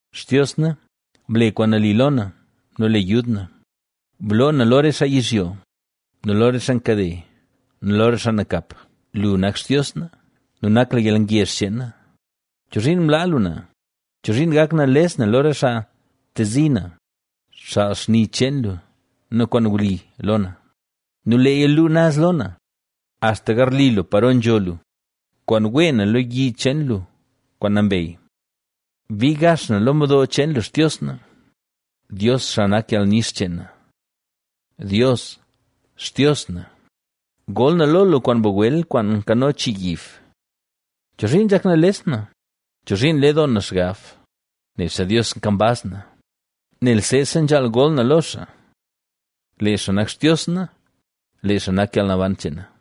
¡Xtios na, ble kwaan nali lo na nu le yud na! ¡Bloo na lo re xaa yizhyo, lo re xaa nkade nu lo re xaa nakap! Lu nak Xtios na nu nak lu yalngezh cheen na, ¿Chozhiin mlaa lu na? ¿Chozhiin gak nales na lo re xaa ntezi na? Xaal xni cheen lu nu kwaan wli lo na nu leeya luu naz lo na, axta garli lu paro nzho lu, kwaan wee na lo yi cheen lu kwaan nambey. Bii gax na lo mdo cheen Xtios na, Dios, xaa nak yalnix cheen na. Dios, Xtios na, gol na lo lu kwaan bagwel kwaan nkano chii yib. ¿Chozhiin nzhak nales na? ¿Chozhiin nle doo na xgab? Nebse Dios nkambaz na, nel seesa nzhaal gol na lo xaa. ¡Lee xaa nak Xtios na! ¡Lee xaa nak yalnaban cheen na!